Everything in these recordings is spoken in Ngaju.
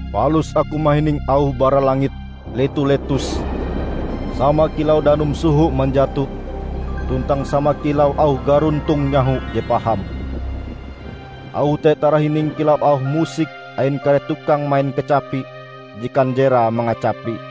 Palus aku mahining auh bara langit letu-letus sama kilau danum soho manjato tuntang sama kilau auh garuntong nyaho je paham. Auh te tarahining kilau auh musik ain kare tukang main kacapi je kanjerae mangacapi.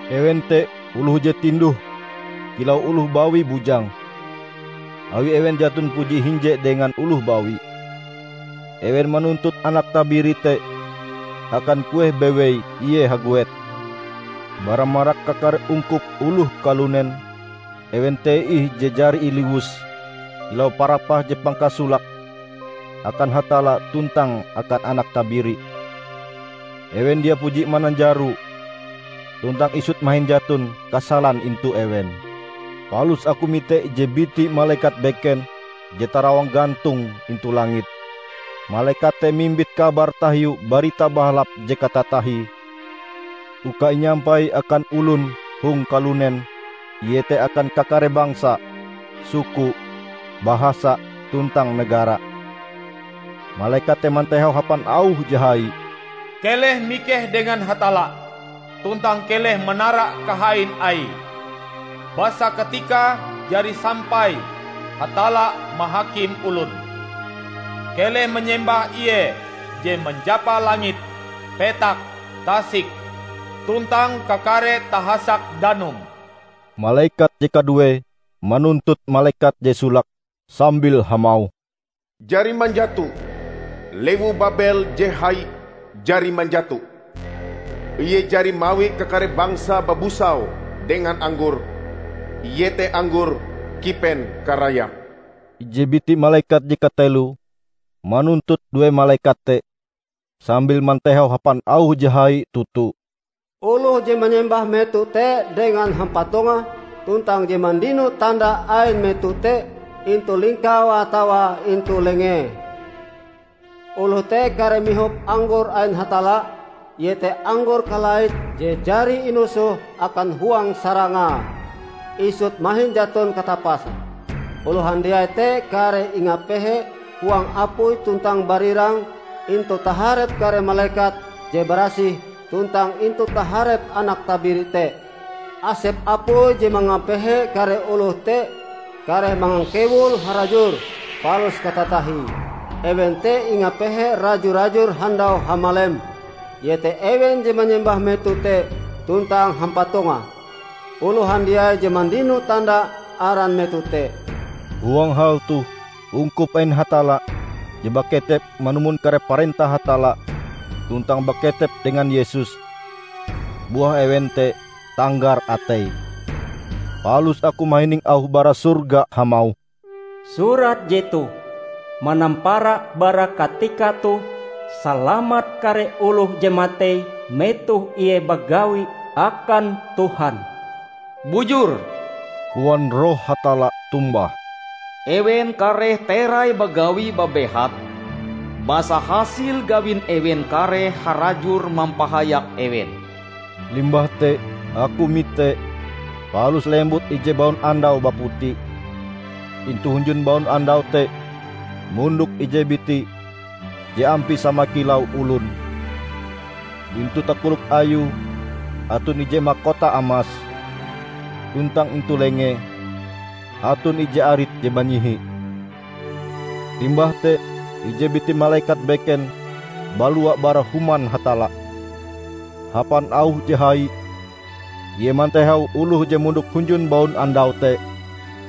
Ewen te oloh je tinduh kilau oloh bawi bujang, awi ewen jaton puji hinje dengan oloh bawi. Ewen manuntut Anak Tabiri te akan kueh bewei ie haguet. Bara marak kakare ungkup oloh kalunen, ewen te ih je jari iliwus kilau parapah je pangkasolake akan Hatalla tuntang akan Anak Tabiri. Ewen dia puji mananjaro; tuntang isut mahin jaton kasalan intu ewen. Palus aku mite ije biti malekat beken je tarawang gantong intu langit. Malekat te mimbit kabar tahiu Barita Bahalap je katatahie uka inyampai akan olon hong kalunen iete akan kakare bangsa, suku, bahasa tuntang negara. Malekat te mantehau hapan auh je hai, "Keleh mikeh dengan Hatalla, tuntang keleh manara kahain Aie! Basa katikae jari sampai Hatalla mahakim olon. Keleh manyembah Ie je manjapa langit, petak, tasik tuntang kakare tahasak danum!" Malekat je kaduee manuntut malekat je solake sambil hamauh, "Jari manjato! Lewu Babel je hai jari manjato! Ie jari mawi kakare bangsa babusau dengan anggor -- iete anggor kipen karayape!" Ije biti malekat je kateloe manuntut due malekat te, sambil mantehau hapan auh je hai toto, "Oloh je manyembah meto te dengan hampatonge, tuntang je mandino tanda ain meto te intu lingkaue atawa intu lengee, oloh te kareh mihop anggor ain Hatalla, iete anggor kalait je jari inusoh akan huang sarangae, isut mahin jaton katapase. Oloh handiai te kareh ingapehe huang apui tuntang barirang intu taharep kare malekat je barasih tuntang intu taharep Anak Tabiri te. Asep apui je mangapehe kare oloh te kareh mangangkewul harajur palus katatahie. Ewen te ingapehe raju-rajur handau hamalem, iete ewen je manyembah meto te tuntang hampatonge, oloh handiai je mandino tanda aran meto te." Huang hal toh ungkup ain Hatalla je baketep manumon kare parentah Hatalla tuntang baketep dengan Yesus, buah ewen te tanggar ateie. Palus aku mahining auh bara sorga hamauh, "Surat jetoh: Manampara bara katika toh, salamat kare oloh je matei metoh ie bagawi akan Tuhan!" "Bujur!" koan Roh Hatalla tombah. "Ewen kareh terai bagawi babehat basa hasil gawin ewen kareh harajur mampahayak ewen." Limbah te aku mite, palus lembut ije baunandau baputi. Intu hunjun baunandau te mondok ije biti je ampie sama kilau olon. Intu takolok Ayue aton ije makota amas, tuntang intu lengee aton ije arit je banyihi. Limbah te ije biti malekat beken balua bara Human Hatalla. Hapan auh je hai, ie mantehau oloh je mondok hunjun baunandau te,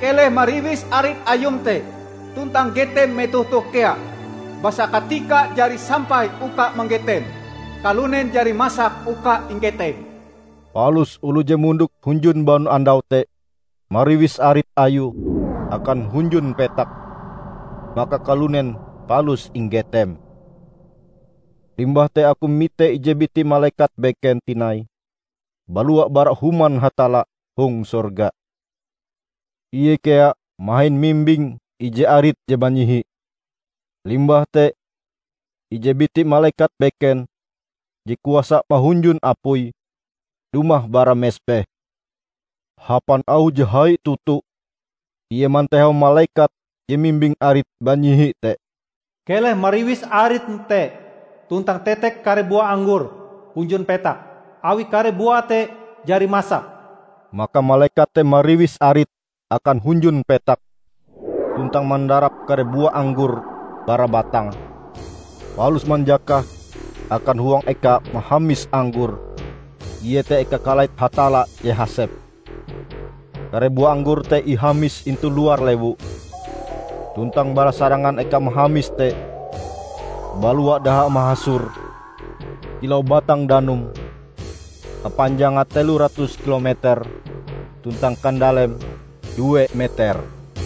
"Keleh mariwis arit Ayum te tuntang getem metoh toh kea, basa katikae jari sampai uka manggetem; kalunen jari masak uka inggetem!" Palus oloh je mondok hunjun baunandau te mariwis arit Ayue akan hunjun petak maka kalunen palus inggetem. Limbah te aku mite ije biti malekat beken tinai balua bara Human Hatalla hong sorga. Ie kea mahin mimbing ije arit je banyihi. Limbah te, ije biti malekat beken, je kuasa mahunjun apui, dumah bara mesbeh. Hapan auh je hai toto ie mantehau malekat je mimbing arit banyihi te, "Keleh mariwis aritm te tuntang tetek kare bua anggor hunjun petak, awi kare buae te jari masak!" Maka malekat te mariwis arite akan hunjun petak tuntang mandarap kare bua anggor bara batange, palus manjakahe akan huang eka mahamis anggor, iete eka kalait Hatalla je hasep. Kare bua anggor te ihamis intu luar lewu, tuntang bara sarangan eka mahamis te balua daha mahasor kilau batang danum kapanjange telo ratus kilo meter tuntang kandaleme due meter.